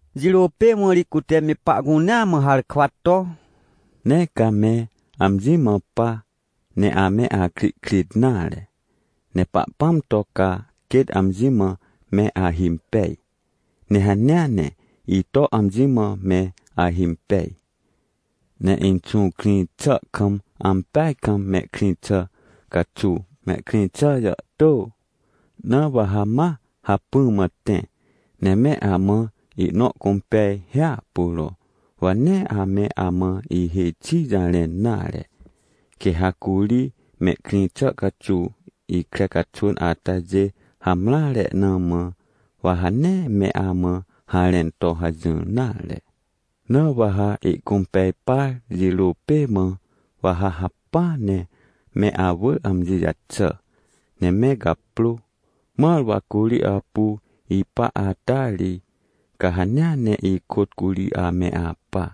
Jirô pê mã ri cute me pahcunea mã harkwa to: — Nee ca me amji mã pa, ne ame akrihkrit nare. Ne Pahpãm to ca quêt amji mã me ahimpej, ne hanea ne ito amji mã me ahimpej. Ne Inxũ krĩ xà kam ampeaj kam mehkrĩ xà caxuw mehkrĩ xà jàhtô, na wa ha ma hacpỹ mã tẽ, ne me amã ihnõ cũmpej hiahpuro. Wa nee ame amã ihêj xi jarẽn nare, quê ha curi mehkrĩ xà caxuw ikre caxwỳn atajê hamreare na mã, wa ha nee me amã harẽn to hajỹr nare. Na wa ha ihcũmpej par jirô pê mã, wa ha hacpỹa ne me awỳr amji jaxà, ne me gaprô, mãr wa curi apu ipa ata ri, ca hanea ne ikôt curi ame apa.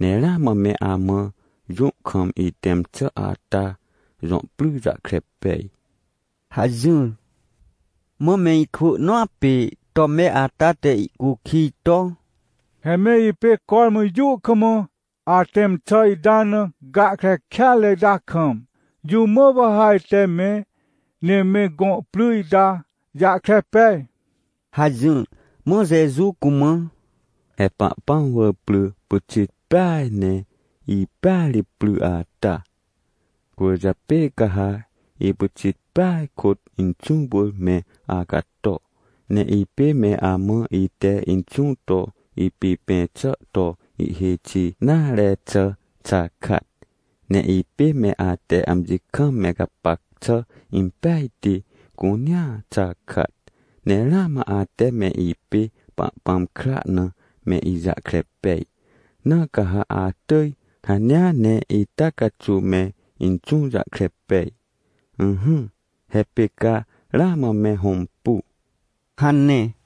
— Ne ramã me amã jũ kam itẽm xà ata jõ pry jahkre pej — hajỹr. Mã me ikwỳ nõa pê Tome ata te ihcukij to: — He me ipê cormã jũ kam atẽm xà ita na gahkre kêatre ita kam, jũ mã wa ha ajte me, ne me gõ pry ita jahkre pej? — hajỹr. Mã Jeju cumã: — He Pahpãm wỳr pry pyxit peaj. Ne ipêa ri pry ata. Cwỳrjapê ca ha ipyxit peaj kôt Inxũ wỳr me acato. Ne ipê me amã ite Inxũ to ipipẽ xà to ihêj xi nare xà xakat. Ne ipê me ate amji kam me gapac xà impejti cunea xakat. Ne ramã ate me ipê Pahpãm kra na me ijahkre pej, na ca ha atỳj hanea ne ita caxuw me Inxũ jahkre pej. Ỹhỹ, he pê ca ramã me hõmpu — hane.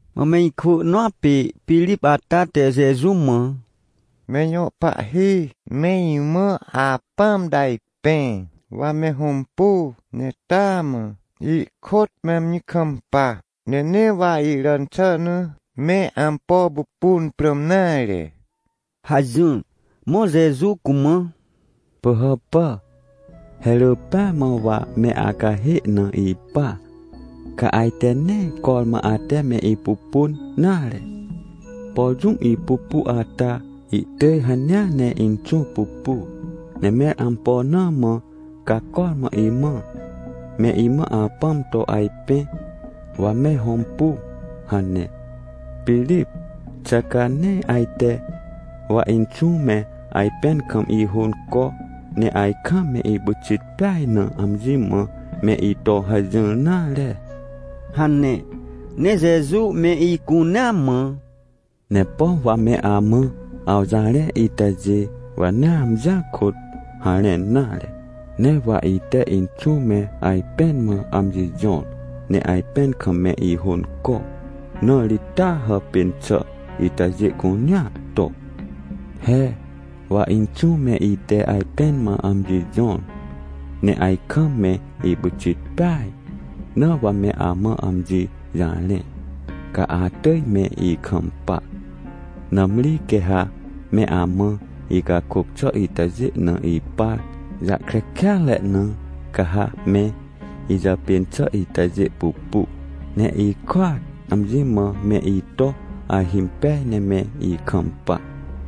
Mã me ikwỳ nõa pê Pirip ata te Jeju mã: — Me ijõ Pahhi, me imã Apãm to ajpẽ, wa me hõmpu, ne tahnaa mã ihkôt me amji kampa, ne nee wa iràn xà na me ampo pupun prãm nare — hajỹr. Mã Jeju cumã: — Pỳhàpà, he rỳ pêa mã wa me acahê na ipa, ca ajte nee cormã ate me ipupun nare? Por jũm ipupu ata, ihtỳj hanea ne Inxũ pupu, ne mẽr ampo na mã ca cormã imã: “Me imã Apãm to ajpẽ, wa me hõmpu” hane? Pirip, xà ca nee ajte, wa Inxũ me ajpẽn kam ihônco, ne ajkam me ipyxit peaj na amji mã me ito hajỹr nare? — hane. Ne Jeju me icunea mã: — Ne pom wa me amã awjarẽ itajê, wa nee amjia kôt harẽn nare. Ne wa ite Inxũ me ajpẽn mã amji jõr, ne ajpẽn kam me ihônco, na ri taa hàpên xà itajê cunea to. He, wa Inxũ me ite ajpẽn mã amji jõr, ne ajkam me ipyxit peaj, na wa me amã amji jarẽ, ca atỳj me ikampa. Nãmri quê ha me amã icakôc xà itajê na ipar jahkre kêatre na, ca ha me ijàpên xà itajê pupu, ne ihkôat amji mã me ito ahimpej ne me ikampa.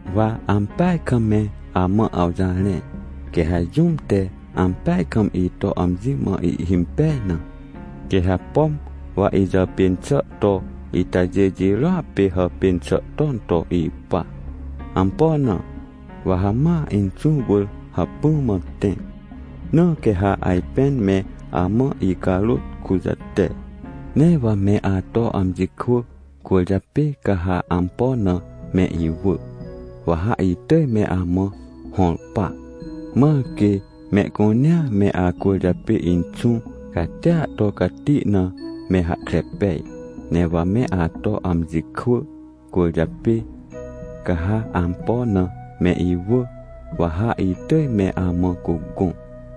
— Wa ampeaj kam me amã awjarẽ, quê ha jũm te ampeaj kam ito amji mã ihhimpej na, quê ha, pom wa ijàpên xà to itajê jirôa pê hàpên xà ton to ipa. Ampo na? Wa ha ma Inxũ wỳr hacpỹ mã tẽ, na quê ha ajpên me amã icarôt kujate. Ne wa me ato amji kwỳ cwỳrjapê ca ha ampo na me iwỳ, wa ha itỳj me amã hõr pa, mãr quê mehcunea me acwỳrjapê Inxũ catia to cati na me hahkre pej. Ne wa me ato amji kwỳ cwỳrjapê, ca ha ampo na me iwỳ, wa ha itỳj me amã cugõ.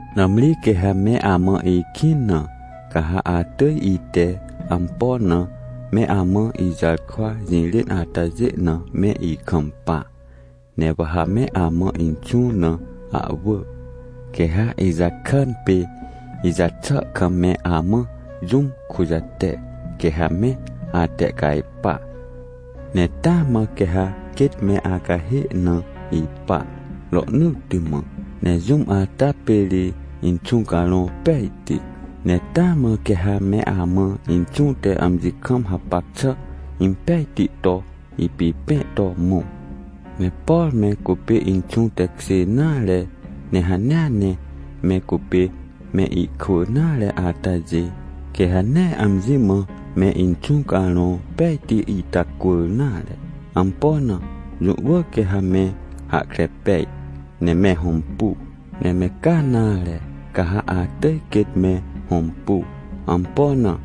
— Nãmri quê ha me amã ikĩn na, ca ha atỳj ite ampo na me amã ijarkwa jirên atajê na me ikampa. Ne wa ha me amã Inxũ na ahwỳ, quê ha ijakàn pê ijaxà kam, me amã jũm kujate, quê ha me atehcajpa. Ne taa mã quê ha quêt me acahê na ipa rohnỳtti mã. Ne jũm ata pê ri Inxũ Carõ Pejti. Ne taa mã quê ha me amã Inxũ te amji kam hapac xà impejti to ipipẽ to mõ. Ne por me cupê Inxũ tekjê nare, ne hanea ne me cupê me ikwỳ nare atajê, quê ha nee amji mã me Inxũ Carõ Pejti itacwỳr nare. Ampo na? Jũ wỳr quê ha me hahkre pej, ne me hõmpu. Ne me ca nare, ca ha atỳj quêt me hõmpu. Ampo na?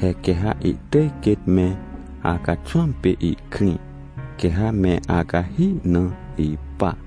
He quê ha ihtỳj quêt me acaxwãm pê ihkrĩ, quê ha me acahi na ipa.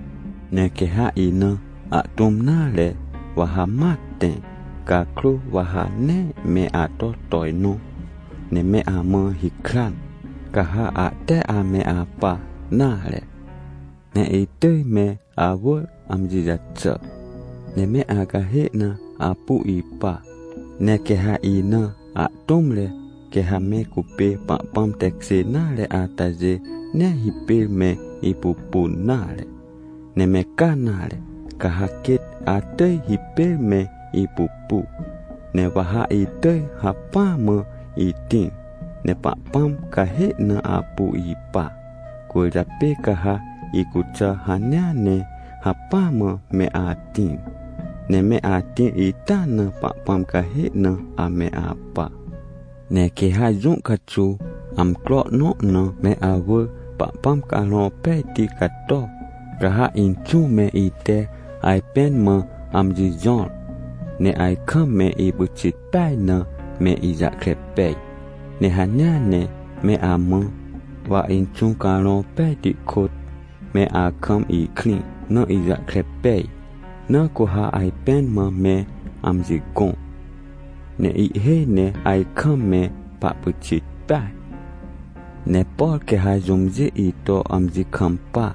— Ne quê ha ina ahtũm nare, wa ha ma tẽ cakrô, wa ha nee me ato tojnõ ne me amã hikran, ca ha ahte ame apa nare. Ne itỳj me awỳr amji jaxà, ne me acahê na apu ipa. Ne quê ha ina ahtũmre quê ha me cupê Pahpãm tekjê nare atajê nee hipêr me ipupun nare, ne me ca nare, ca ha quêt atỳj hipêr me ipupu. Ne wa ha itỳj hacpỹa mã itĩr ne Pahpãm cahê na apu ipa. Cwỳrjapê ca ha icuxà hanea ne hacpỹa mã me atĩr, ne me atĩr ita na Pahpãm cahê na ame apa. Ne quê ha jũ caxuw, amcro nõ na me awỳr Pahpãm Carõ Pejti cato, ca ha Inxũ me ite ajpẽn mã amji jõr, ne ajkam me ipyxit peaj na me ijahkre pej. Ne hanea ne me amã, wa Inxũ Carõ Pejti kôt, me akam ikrĩ na ijahkre pej, na cu ha ajpẽn mã me amji gõ, ne ihhêj ne ajkam me pahpyxit peaj. — Ne por quê ha jũmjê ito amji kampa,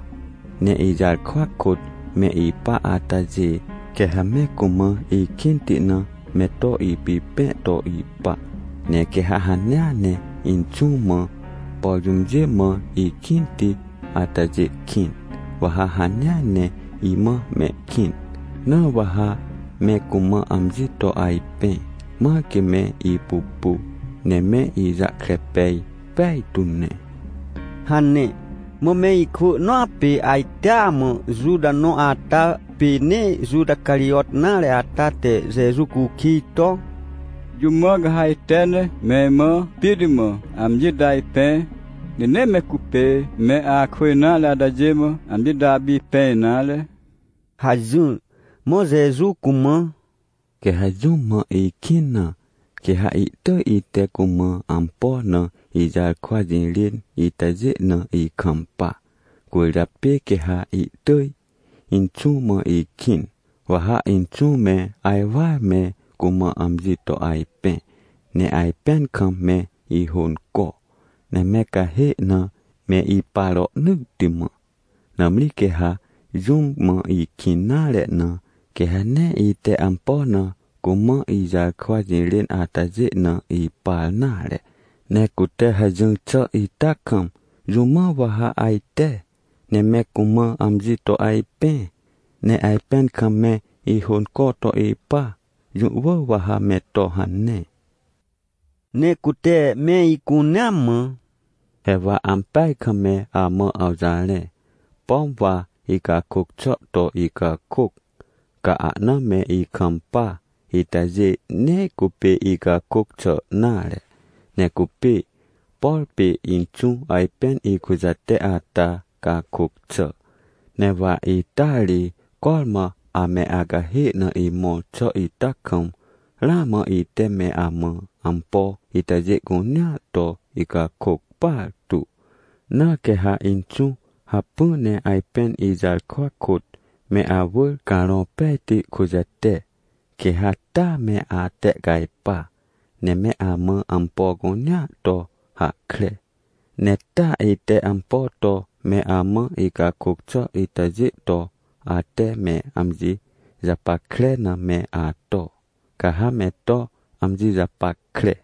ne ijarkwa kôt me ipa atajê, quê ha me cumã ikĩnti na me to ipipẽ to ipa. Ne quê ha hanea ne Inxũ mã, por jũmjê mã ikĩnti atajê kĩn, wa ha hanea ne imã mehkĩn, na wa ha me cumã amji to ajpẽ, mãr quê me ipupu ne me ijahkre pej pejtu ne — hane. Mã me ikwỳ nõa pê ajtea mã Juta nõ ata, pê nee Juta Carijot nare ata te Jeju cukij to: — Jũ mã ca ha ajte ne me imã pit mã amji to ajpẽ? Ne nee me cupê me akwỳ nare atajê mã amji to apipẽ nare? — hajỹr. Mã Jeju cumã: — Quê ha jũm mã ikĩn na, quê ha ihtỳj ite cumã ampo na ijarkwa jirên itajê na ikampa. Cwỳrjapê quê ha ihtỳj Inxũ mã ihkĩn, wa ha Inxũ me ajwar me cumã amji to ajpẽ, ne ajpẽn kam me ihônco, ne me cahê na me ipa rohnỳtti mã. Nãmri quê ha jũm mã ikĩn nare na, quê ha nee ite ampo na cumã ijarkwa jirên atajê na ipar nare. Ne cute hajỹr xà ita kam jũmã wa ha ajte, ne me cumã amji to ajpẽ, ne ajpẽn kam me ihônco to ipa? Jũ wỳr wa ha me to hane — hane. Ne cute me icunea mã: — He wa ampeaj kam me amã awjarẽ. Pom wa icakôc xà to icakôc, ca ahna me ikampa itajê nee cupê icakôc xà nare, ne cupê, por pê Inxũ ajpên ikujate ata cakôc xà. — Ne wa ita ri cormã ame acahê na imõr xà ita kam, ramã ite me amã ampo itajê cunea to icakôc partu. Na quê ha Inxũ hacpỹ ne ajpên ijarkwa kôt me awỳr Carõ Pejti kujate, quê ha taa me atehcajpa, ne me amã ampo cunea to hahkre. Ne taa ite ampo to me amã icakôc xà itajê to, ate me amji japackre na me ato, ca ha me to amji japackre.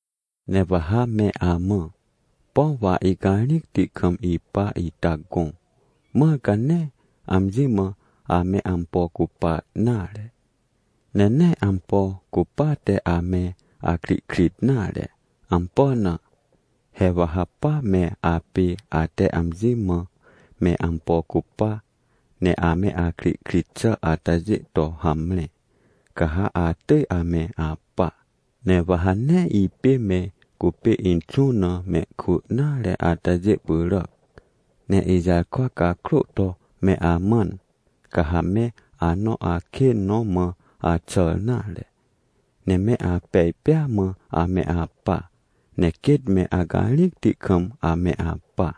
— Ne wa ha me amã, pom wa icarĩcti kam ipa ita gõ, mãr ca nee amji mã ame ampo cupa nare, ne nee ampo cupate ame akrihkrit nare. Ampo na? He wa ha pa me apê ate amji mã me ampo cupa, ne ame akrihkrit xà atajê to hamre, ca ha atỳj ame apa. Ne wa ha nee ipê me cupê Inxũ na mehkwỳ nare atajê pyràc, ne ijarkwa cakrô to me amãn, ca ha me anõ akên nõ mã axàr nare, ne me apej pêa mã ame apa, ne quêt me acarĩcti kam ame apa.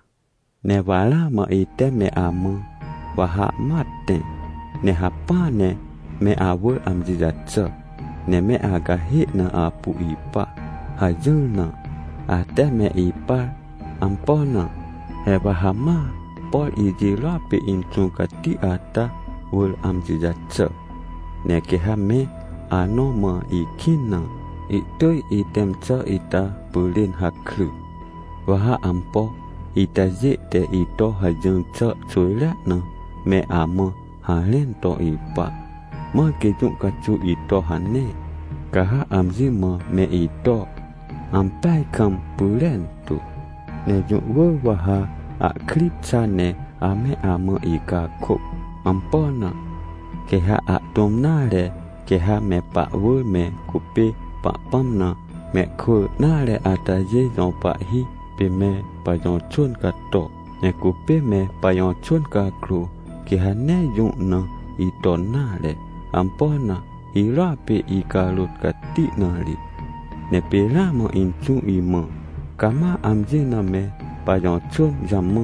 Ne wa ramã ite me amã: “Wa ha ma tẽ, ne hacpỹa ne me awỳr amji jaxà, ne me acahê na apu ipa” hajỹr na, ate me ipar. Ampo na? He wa ha ma, por ijirôa pê Inxũ Cati ata wỳr amji jaxà. Ne quê ha me anõ mã ikĩn na, ihtỳj itẽm xà ita pyrên hakry. Wa ha ampo itajê te ito hajỹr xà xwỳjrea na me amã harẽn to ipa, mãr quê jũ caxuw ito hane, ca ha amji mã me ito ampeaj kam pyrentu. Ne jũ wỳr wa ha ahkri xa ne ame amã icakôc. Ampo na? Quê ha ahtũm nare, quê ha me pahwỳr me cupê Pahpãm na mehkwỳ nare atajê jõ pahhi, pê me pajõ xwỳn cato. Ne cupê me pajõ xwỳn cakrô, quê ha nee jũ na iton nare. Ampo na? Hirôa pê icarôt cati na ri. Ne pê ramã Inxũ imã: “Cama amji na me pajõ xwỳn jamã,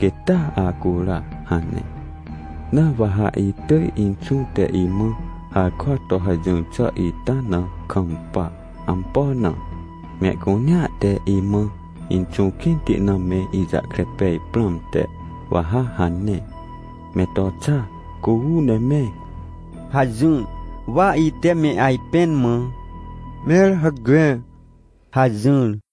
quêt taa acura” hane. Na wa ha itỳj Inxũ te imã harkwa to hajỹr xà ita na kampa. Ampo na? Mehcunea te imã Inxũ kĩnti na me ijahkre pej prãmte, wa ha hane. Me to xa cu uu ne me — hajỹr. Wa ite me ajpẽn mã: — Mẽr hacme — hajỹr.